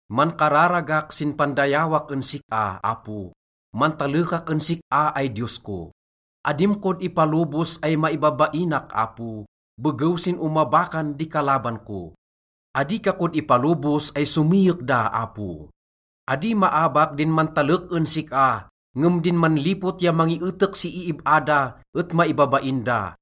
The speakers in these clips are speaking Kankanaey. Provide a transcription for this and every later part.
Mankararagak sin pandayawak en sik-a, Apo. Mantalekak en sik-a ay Diyos ko. Adim kod ipalobos ay maibabainak, Apo, begew sin omabakan di kalaban ko. Adi ka kod ipalobos ay somiyek da, Apo. Adi maabak din mantalek en sik-a, ngem din manlipot ya mangietek si iib-a da et maibabain da.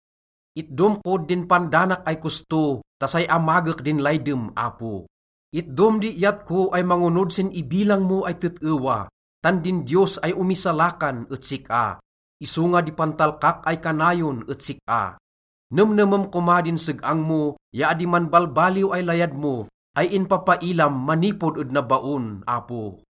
Itdom kod din pandanak ay kosto ta say amagek din laydem, Apo. Itdom di iyat ko ay mangonod sin ibilang mo ay tet-ewa, tan din Diyos ay omisalakan et sik-a, isonga di pantalkak ay kanayon et sik-a. Nemnemem koma din seg-ang mo ya adi manbalbaliw ay layad mo ay inpappailam manipod ed nabaon, Apo.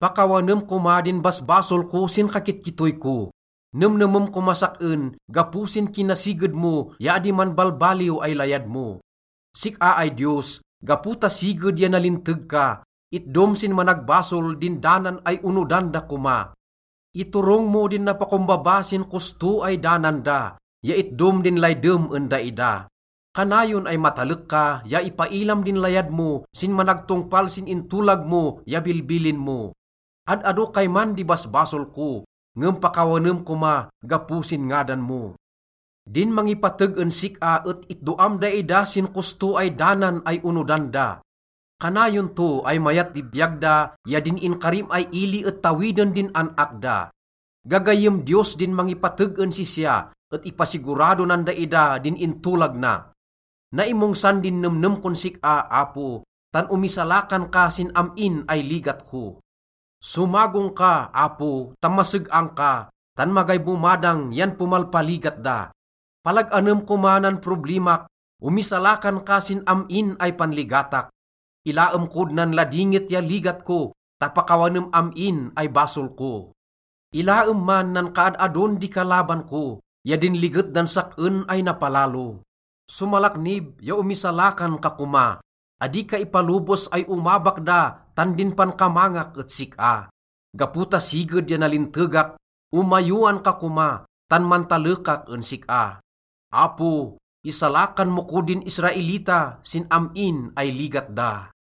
Pakawanem koma din basbasol ko sin kakitkittoy ko. Nemnemem komas sak-en gapo sin kinasiged mo ya adi manbalbaliw ay layad mo. Sik-a ay Diyos, gapo ta siged ya nalinteg ka, itdom sin managbasol din danan ay onodan da koma. Iturong mo din napakombaba sin kosto ay danan da ya itdom din laydem en daida. Kanayon ay matalek ka ya ipailam din layad mo sin managtongpal sin intolag mo ya bilbilin mo. Ad-ado kayman di basbasol ko, ngem pakawanem koma gapo sin ngadan mo. Din mangipateg en sik-a et itdoam daida sin kosto ay danan ay onodan da. Kanayon to ay mayat di biyag da ya din inkarim ay ili et tawiden din an-ak da. Gagayyem Diyos din mangipateg en sisya et ipasigurado nan daida din intolag na. Naimongsan din nemnem kon sik-a, Apo, tan omisalakan ka sin am-in ay ligat ko. Somagong ka, Apo, ta maseg-ang ka, tan magay bomadang yan pomalpaligat da. Palag-anem koma nan problimak, omisalakan ka sin am-in ay panligatak. Ilaem kod nan ladingit ya ligat ko ta pakawanem am-in ay basol ko. Ilaem man nan kaad-adon di kalaban ko ya din liget dan sak-en ay napalalo. Somalaknib ya omisalakan ka koma, adi ka ipalobos ay omabak da tan din pankamangak et sik-a. Gapo ta siged ya nalintegak, omayowan ka koma, tan mantalekak en sik-a. Apo, isalakan mo kod din Israelita sin am-in ay ligat da.